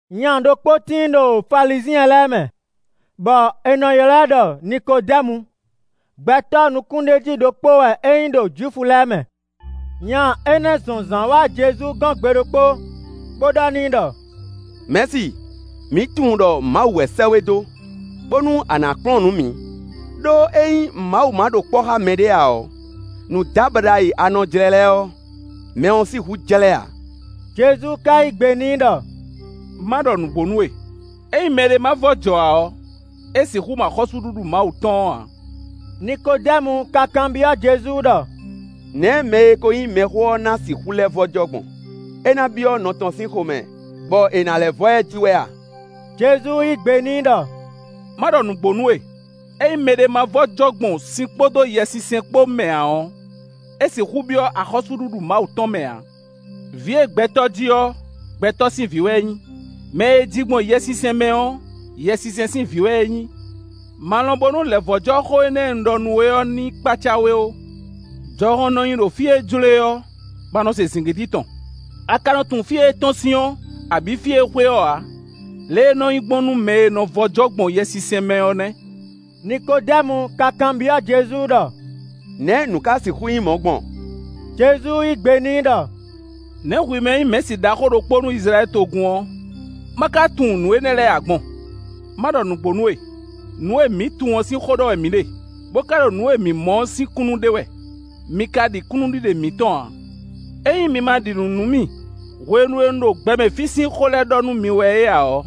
Nya ɖokpó tíin ɖo Falizyɛn lɛ́ɛ mɛ, bɔ è nɔ ylɔ́ ɛ ɖɔ Nikodɛ́mu. Gbɛtɔ́ nukúnɖéjí ɖokpó wɛ é nyí ɖo Jwifu lɛ́ɛ mɛ. Nya énɛ́ zɔn zǎn wá Jezu gɔ́n gbe ɖokpó bó ɖɔ n'i ɖɔ: “Mɛ̌si, mǐ tunwun ɖɔ Mawu wɛ sɛ́ we dó, bónú a nǎ kplɔ́n nǔ mǐ. Đó, ényí Mawu ma ɖo kpɔ́ xá mɛɖé ǎ ɔ́, nǔdábaɖa e a nɔ jlɛ́ lɛ́ɛ ɔ́, mɛ ɔ́ sixú jlɛ́ ǎ.” Jezu ka yí gbe n'i ɖɔ: “Má ɖɔ nǔgbó nú we: ényí mɛɖé má vɔ́ jɔ ǎ ɔ́, é sixú mɔ axɔ́súɖuɖu Mawu tɔn ɔ́ ǎ.” Nikodɛ́mu ka kanbyɔ́ Jezu ɖɔ: “Nɛ̌ mɛ e ko nyí mɛxó ɔ́ ná sixú lɛ́ vɔ́ jɔ gbɔn? É ná byɔ́ nɔ tɔn sín xomɛ, bɔ è ná lɛ́ vɔ́ ɛ ji wɛ a?” Jezu yí gbe n'i ɖɔ: “Má ɖɔ nǔgbó nú we: ényí mɛɖé má vɔ́ jɔ gbɔn sin kpódó Yɛsinsɛn kpó mɛ ǎ ɔ́, é sixú byɔ́ axɔ́súɖuɖu Mawu tɔn mɛ ǎ. Vǐ e gbɛtɔ́ ji ɔ́, gbɛtɔ́ sin vǐ wɛ é nyí; mɛ e è ji gbɔn Yɛsinsɛn mɛ ɔ́, Yɛsinsɛn sin vǐ wɛ é nyí. Ma lɔn bónú lɛ̌vɔ́jɔ xó énɛ́ e un ɖɔ nú we ɔ́ ní kpácá we ó. Jɔhɔn nɔ nyi ɖo fí e jló e ɔ́, bɔ a nɔ se zǐngídi tɔn; a ka nɔ tunwun fí e é tɔ́n sín ɔ́, abǐ fí e é xwe ɔ́ ǎ. Lě e é nɔ nyí gbɔn nú mɛ e vɔ́ jɔ gbɔn Yɛsinsɛn mɛ ɔ́ nɛ́.” Nikodɛ́mu ka kanbyɔ́ Jezu ɖɔ: “Nɛ̌ nǔ ka sixú nyí mɔ̌ gbɔn?” Jezu yí gbe n'i ɖɔ: “Nɛ̌ hwi mɛ e nyí mɛ̌si ɖaxó ɖokpó nú Izlayɛ́li togun ɔ́, ma ka tunwun nǔ énɛ́ lɛ́ɛ ǎ gbɔn? Ma ɖɔ nǔgbó nú we: Nǔ e mǐ tunwun ɔ́ sín xó ɖɔ wɛ mǐ ɖe, bó ka ɖo nǔ e mǐ mɔ ɔ́ sín kúnnu ɖe wɛ; mi ka ɖi kúnnuɖiɖe mǐtɔn ǎ. Ényí mi ma ɖi nǔ nú mì hwenu e un ɖo gbɛmɛ fí sín xó lɛ́ɛ ɖɔ nú mi wɛ é ǎ ɔ́,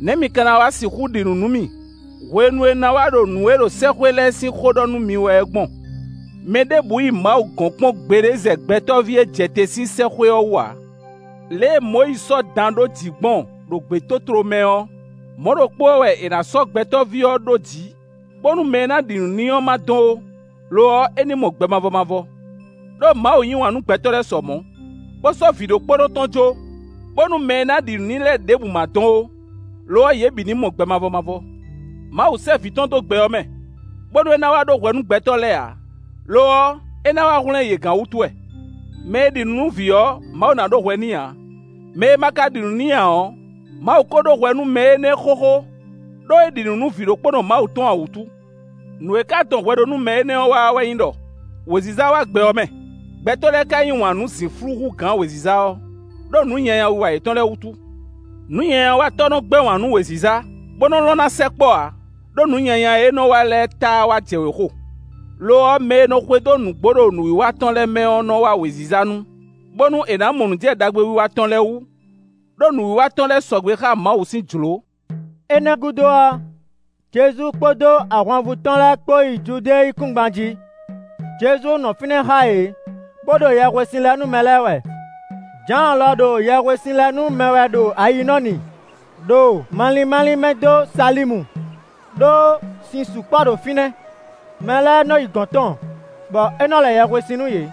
nɛ̌ mi ka na wá sixú ɖi nǔ nú mì hwenu e un ná wá ɖo nǔ e ɖo sɛ́xwé lɛ́ɛ sín xó ɖɔ nú mi wɛ é gbɔn? Mɛ ɖěbǔ yi Mawu gɔ̌n kpɔ́n gbeɖé zɛ Gbɛtɔ́ví e jɛ te sín sɛ́xwé ɔ́ wú ǎ. Lě e Mɔyízi sɔ́ dan ɖó jǐ gbɔn ɖo gbětótló mɛ ɔ́, mɔ̌ ɖokpó ɔ́ wɛ è nǎ sɔ́ Gbɛtɔ́ví ɔ́ ɖó jǐ, bónú mɛ e ná ɖi nǔ n'i ɔ́ ma dɔn ó; lo ɔ́, é ní mɔ gbɛ mavɔ mavɔ. Đó Mawu yí wǎn nú gbɛtɔ́ sɔ mɔ̌, bó sɔ́ Vǐɖokpónɔ tɔn jó, bónú mɛ e ná ɖi nǔ n'i lɛ́ɛ ɖěbǔ ma dɔn ó; lo ɔ́, yě bǐ ní mɔ gbɛ mavɔ mavɔ. Mawu sɛ́ Vǐ tɔn dó gbɛ ɔ́ mɛ, bónú é ná wá ɖó hwɛ nú gbɛtɔ́ lɛ́ɛ ǎ; lo ɔ́, é ná wá hwlɛ́n yě gán wútu wɛ. Mɛ e ɖi nǔ nú vǐ ɔ́, Mawu ná ɖó hwɛ n'i ǎ; mɛ e ma ka ɖi nǔ n'i ǎ ɔ́, Mawu ko ɖó hwɛ nú mɛ énɛ́ xóxó, ɖó é ɖi nǔ nú Vǐɖokpónɔ Mawu tɔn ǎ wútu. Nǔ e ka dɔn hwɛɖónúmɛ énɛ́ wá ɔ́ wɛ nyí ɖɔ: wěziza wá gbɛ ɔ́ mɛ, gbɛtɔ́ lɛ́ɛ ka yí wǎn nú zǐnflú hú gǎn wěziza ɔ́, ɖó nǔ nyanya wiwa yětɔn lɛ́ɛ wútu. Nǔnyanyawatɔ́ nɔ gbɛ́ wǎn nú wěziza, bó nɔ lɔn ná sɛkpɔ́ ǎ; ɖó nǔ nyanya e é nɔ wa lɛ́ɛ táá wá jɛ wěxo. Lo ɔ́, mɛ e nɔ xwedó nǔgbó ɖo nǔwiwa tɔn lɛ́ɛ mɛ ɔ́ nɔ́ wá wěziza nu, bónú è nǎ mɔ nǔ jɛ ɖagbewiwa tɔn lɛ́ɛ wú; ɖó nǔwiwa tɔn lɛ́ɛ sɔgbe xá Mawu sín jlǒ.” Énɛ́ gúdo ɔ́, Jezu kpódó ahwanvú tɔn lɛ́ɛ kpó yi Judée yíkúngban jí. Jezu nɔ fínɛ́ xá yě, bó ɖo yɛhwesin lɛ nú mɛ lɛ́ɛ wɛ. Jǎan lɔ ɖo yɛhwesin lɛ nú mɛ wɛ ɖo Ayinɔ́ni, ɖo malín málín mɛ dó Salímu; ɖó sin sukpɔ́ ɖo fínɛ́. Mɛ lɛ́ɛ nɔ yi gɔ̌n tɔn, bɔ é nɔ lɛ yɛhwesin nú yě.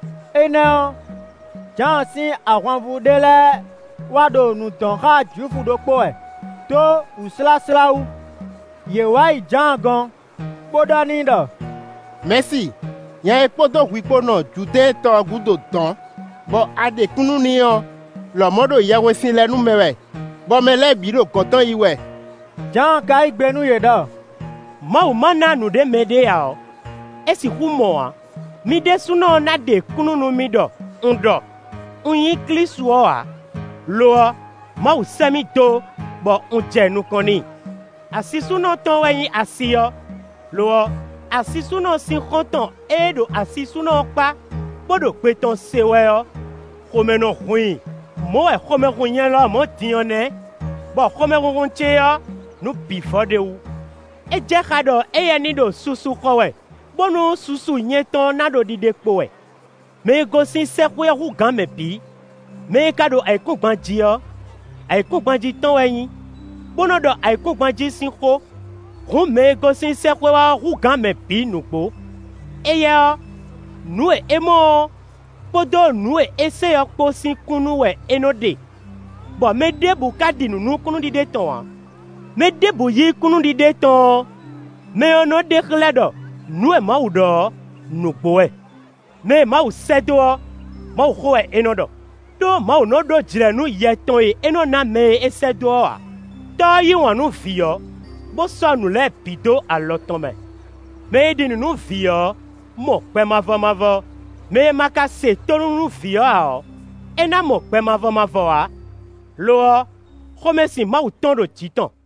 Énɛ́ ɔ́, Jǎan sín ahwanvú ɖé lɛ́ɛ wá ɖo nǔ dɔn xá Jwifu ɖokpó wɛ, dó wǔsláslá wú. Yě wǎ yi Jǎan gɔ́n, bó ɖɔ n'i ɖɔ: “Mɛ̌si, nya e kpódó hwi kpó nɔ Judɛ́ɛn tɔ ɔ́ gúdo dɔ̌n, bɔ a ɖe kúnnu n'i ɔ́ lɔmɔ̌ ɖo yɛhwesin lɛ nú mɛ wɛ, bɔ mɛ lɛ́ɛ bǐ ɖo gɔ̌n tɔn yi wɛ.” Jǎan ka yí gbe nú yě ɖɔ: “Mawu má ná nǔɖé mɛɖé ǎ ɔ́, é sixú mɔ ǎ. Mi ɖésúnɔ ná ɖe kúnnu nú mì ɖɔ un ɖɔ: ‘Un nyí Klísu ɔ́ ǎ; lo ɔ́, Mawu sɛ́ mì dó, bɔ un jɛ nukɔn n'i.’ Asisúnɔ tɔn wɛ nyí asi ɔ́; lo ɔ́, asisúnɔ sín xɔ́ntɔn e ɖo asisúnɔ ɔ́ kpá, bó ɖo gbe tɔn se wɛ ɔ́, xomɛ nɔ hun i. Mɔ̌ wɛ xomɛ hun nyɛ lɔmɔ̌ din ɔ́ nɛ́; bɔ xomɛhunhun ce ɔ́, nǔ bǐ vɔ ɖ'é wú. É jɛ xá ɖɔ éyɛ́ ní ɖo susu xɔ wɛ, bónú susu nyɛtɔn ná ɖo ɖiɖe kpo wɛ.” “Mɛ e gosín sɛ́xwé ɔ́ hú gǎn mɛ bǐ. Mɛ e ka ɖo ayǐkúngban jí ɔ́, ayǐkúngban jí tɔn wɛ é nyí, bó nɔ́ ɖɔ ayǐkúngban jí sín xó. Hǔn, mɛ e gosín sɛ́xwé wá ɔ́ hú gǎn mɛ bǐ nǔgbó. Éyɛ́ ɔ́, nǔ e é mɔ ɔ́, kpódó nǔ e é se ɔ́ kpó sín kúnnu wɛ é nɔ ɖe; bɔ mɛ ɖěbǔ ka ɖi nǔ nú kúnnuɖiɖe tɔn ǎ. Mɛ ɖěbǔ yí kúnnuɖiɖe tɔn ɔ́, mɛ ɔ́ nɔ ɖe xlɛ́ ɖɔ nǔ e Mawu ɖɔ ɔ́, nǔgbó wɛ. Mɛ e Mawu sɛ́ dó ɔ́, Mawuxó wɛ é nɔ ɖɔ; ɖó Mawu nɔ ɖó jlɛ̌ nú Yɛ tɔn e é nɔ ná mɛ e é sɛ́ dó ɔ́ ǎ. Tɔ́ ɔ́ yí wǎn nú Vǐ ɔ́, bó sɔ́ nǔ lɛ́ɛ bǐ dó alɔ tɔn mɛ. Mɛ e ɖi nǔ nú Vǐ ɔ́, mɔ gbɛ mavɔ mavɔ; mɛ e ma ka se tónú nú vǐ ɔ́ ǎ ɔ́, é ná mɔ gbɛ mavɔ mavɔ ǎ; lo ɔ́, xomɛsin Mawu tɔn ɖo jǐ tɔn.”